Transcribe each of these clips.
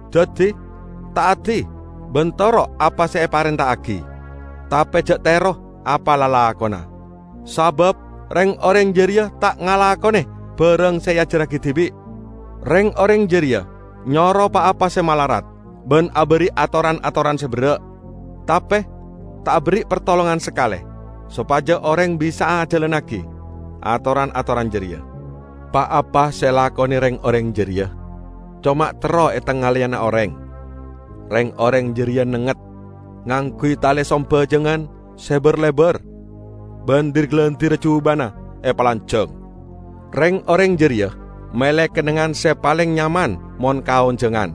Daddi ta'adi ban toro' apa se eparenta'agi. Tape ja' tero apa lalakonna, sabab reng-oreng jareya ta' ngalakone barang se eajarragi dibi'. Reng-oreng jareya nyoro pa-apa se malarat ban aberri' atoran-atoran se berra', tape ta' aberri' partolongan sakale sopaja oreng bisa'a ajalannagi atoran-atoran jareya. Pa-apa se elakone reng-oreng jareya coma terro etangaleyana oreng. Reng-oreng jareya nengnget ngangguy tale sambajangan se bar-lebar, ban dir-galindirra jubana epalanjang! Reng-oreng jareya mele kennengngan se paleng nyaman mon kaonjangan,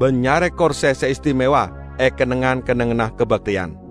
ban nyare korse se istimewa e kennengngan-kennengnganna kabakteyan.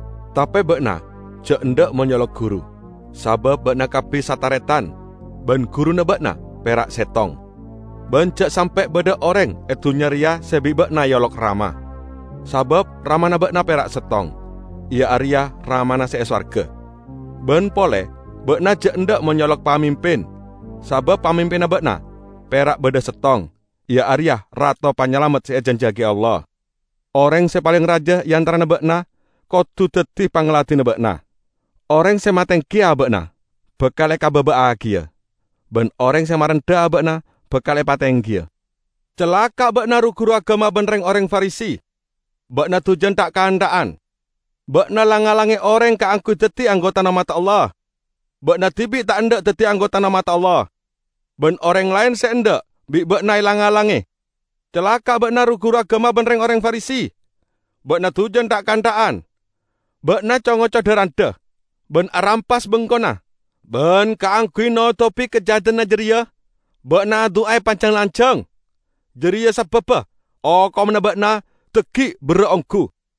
Tape ba'na ja' endha' mon eolok 'Guru', sabab ba'na kabbi sataretan ban Guruna ba'na pera' settong. Ban ja' sampe' badha oreng e dunnya reya se bi' ba'na eolok 'Rama', sabab Ramana ba'na pera' settong, iya areya Ramana se e sowarga. Ban pole ba'na ja' endha' mon eolok 'Pamimpin', sabab pamimpinna ba'na pera' badha settong, iya areya Rato Panyalamet se ejanjiyagi Allah. Oreng se paleng raja e antarana ba'na kodu daddi pangladinna ba'na. Oreng se matenggi aba'na bakal ekababa'agiya, ban oreng se marendha aba'na bakal epatenggiya." "Calaka' ba'na ru-guru agama ban reng-oreng Farisi! Ba'na dujan tha'-kantha'an! Ba'na lang-ngalange oreng kaangguy daddi anggotana ommadda Allah. Ba'na dibi' ta' endha' daddi anggotana ommadda Allah, ban oreng laen se endha' bi' ba'na elang-alange. [ Calaka' ba'na ru-guru agama ban reng-oreng Farisi! Ba'na dujan tha'-kantha'an! Ba'na co-ngoco dha-randha ban arampas bengkona ban kaangguy notobi kajahadanna jareya ba'na adu'a epajang-lanjang. Jareya sababba okomanna ba'na dhaggi' berra' onggu!]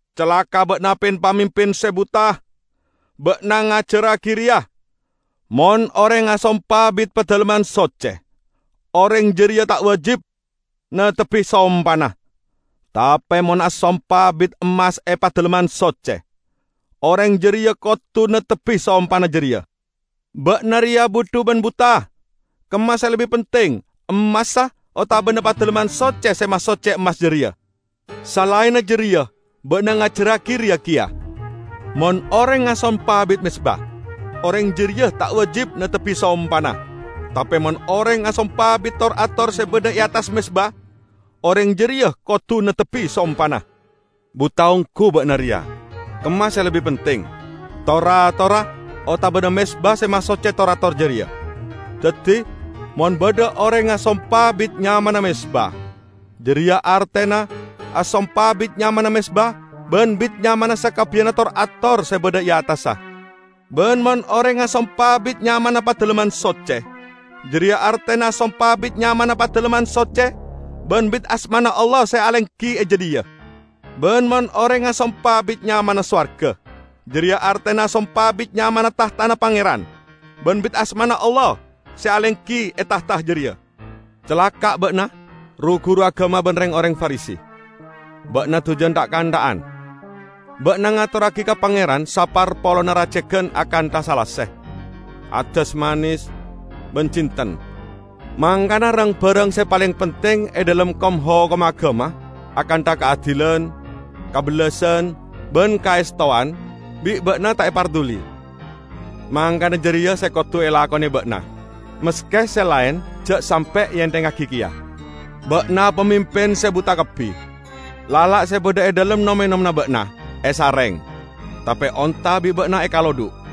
Calaka' ba'na pin-pamimpin se buta! Ba'na ngajarragi reya, 'Mon oreng asompa bit Padalemman Socce, oreng jareya ta' wajib neptebbi sompana; tape mon asompa bit emmas e Padalemman Socce, oreng jareya kodu neptebbi sompana jareya!' Ba'na reya budhu ban buta! Kemma se lebbi penting: emmassa, otabana Padalemman Soccena se masocce emmas jareya? Salaenna jareya ba'na ngajarragi reya keya, 'Mon oreng asompa bit mezba, oreng jareya ta' wajib neptebbi sompana; tape mon oreng asompa bit tor-ator se badha e attas mezba, oreng jareya kodu neptebbi sompana.' Buta onggu ba'na reya! Kemma se lebbi penting? Tor-atorra otabana mezba se masocce tor-ator jareya? Daddi, mon badha oreng asompa bit nyamana mezba, jareya artena asompa bit nyamana mezba, ban bit nyamana sakabbiyanna tor-ator se badha e attassa. Ban mon oreng asompa bit nyamana Padalemman Socce, jareya artena asompa bit nyamana Padalemman Socce, ban bit asmana Allah se alenggi e jadhiya. Ban mon oreng asompa bit nyamana sowarga, jareya artena asompa bit nyamana tahtana Pangeran, ban bit asmana Allah se alenggi e tahta jareya. Calaka' ba'na ru-guru agama ban reng-oreng Farisi! Ba'na dujan tha'-kantha'an! Ba'na ngatorragi ka Pangeran saparpolonna racegan akantha salase, addas manes, ban jinten. Mangkana rang-barang se paleng penting e dhalem kom-hokomma agama, akantha: Kaadilan, kabellasan ban kaestowan, bi' ba'na ta' eparduli. Mangkana jareya se kodu elakone ba'na, maske se laen ja' sampe' eenthengngagi keya! Ba'na pamimpin se buta kabbi! Lala' se badha e dhalem nom-enomanna ba'na esareng, tape onta bi' ba'na ekalodhu'.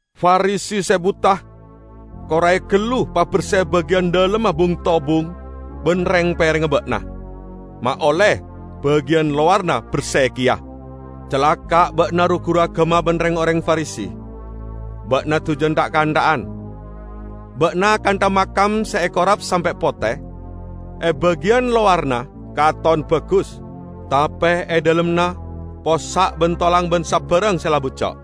Farisi se buta! Korae gallu paberse bagiyan dhalemma bung-tobung ban reng-perengnga ba'na, ma' olle bagiyan lowaranna berse keya! Calaka' ba'na ru-guru agama ban reng-oreng Farisi! Ba'na dujan tha'-kantha'an! Ba'na akantha makam se ekorap sampe' pote; e bagiyan lowaranna katon bagus, tape e dhalemmanna possa' ban tolang ban sabarang se la bucco'.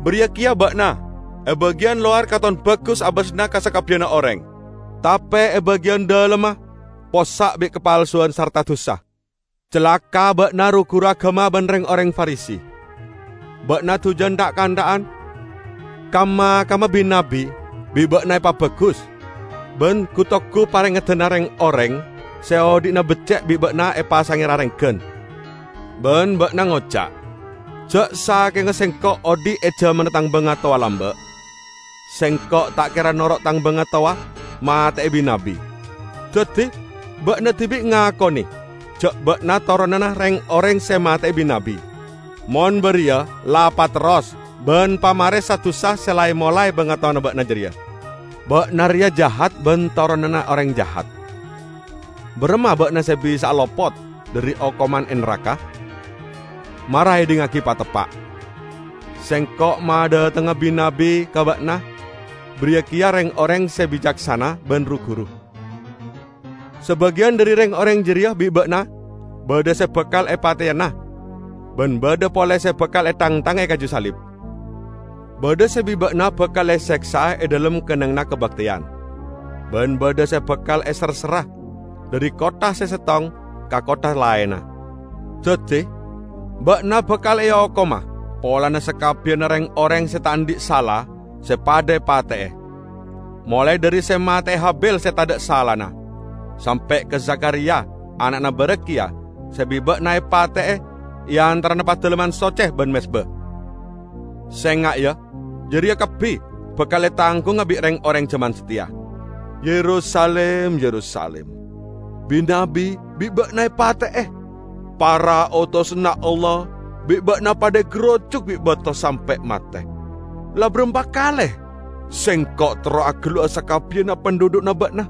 Bariya keya ba'na. E bagiyan lowar katon bagus abasanna ka sakabbiyanna oreng; tape e bagiyan dhalemma possa' bi' kapalsuwan sarta dusa." "Calaka' ba'na ru-guru agama ban reng-oreng Farisi! Ba'na dujan tha'-kantha'an! Kam-makamma bi-nabbi bi' ba'na epabagus, ban gu-tugu parengeddanna reng-oreng se odhi'na becce' bi' ba'na epasange rarenggan. Ban ba'na ngoca', 'Ja' sakenga sengko' odhi' e jamanna tang bangatowa lamba', sengko' ta' kera noro' tang bangatowa mate'e bi-nabbi.' Daddi ba'na dibi' ngakone ja' ba'na toronanna reng-oreng se mate'e bi-nabbi! Mon bariya, la paterros ban pamare sa-dusa se la emolae bangatowana ba'na jareya! Ba'na reya jahat ban toronanna oreng jahat! Baramma ba'na se bisa'a lopot dhari okoman e naraka? Mara edhingngagi pateppa': Sengko' madhatengnga bi-nabbi ka ba'na, bariya keya reng-oreng se bicaksana ban ru-guru; sabagiyan dhari reng-oreng jareya bi' ba'na badha se bakal epateyana, ban badha pole se bakal ethangthanga e kaju salib. Badha se bi' ba'na bakal eseksa'a e dhalem kennengnganna kabakteyan, ban badha se bakal eserserra dhari kottha se settong ka kottha laenna. Daddi, ba'na bakal eokoma polana sakabbiyanna reng-oreng se ta' andhi' sala se padha epate'e -- molae dhari se mate'e Habil se tadha' salana, sampe' ka Zakhariya ana'na Berekhya se bi' ba'na epate'e e antarana Padalemman Socce ban mezba. Senga', ya: jareya kabbi bakal etanggunga bi' reng-oreng jaman sateya!" "Yerusalim, Yerusalim! Bi-nabbi bi' ba'na epate'e. Para otosanna Allah bi' ba'na padha egarujuk bi' bato sampe' mate. La barampa kale Sengko' terro agellu'a sakabbiyanna pandhudhu'na ba'na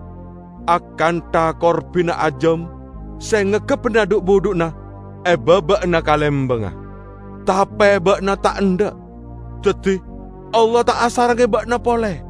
akantha korbina ajam se ngepkebbana dhu'-budhu'na e baba'anna kalembangnga, tape ba'na ta' endha'! Daddi Allah ta' asarengnge ba'na pole.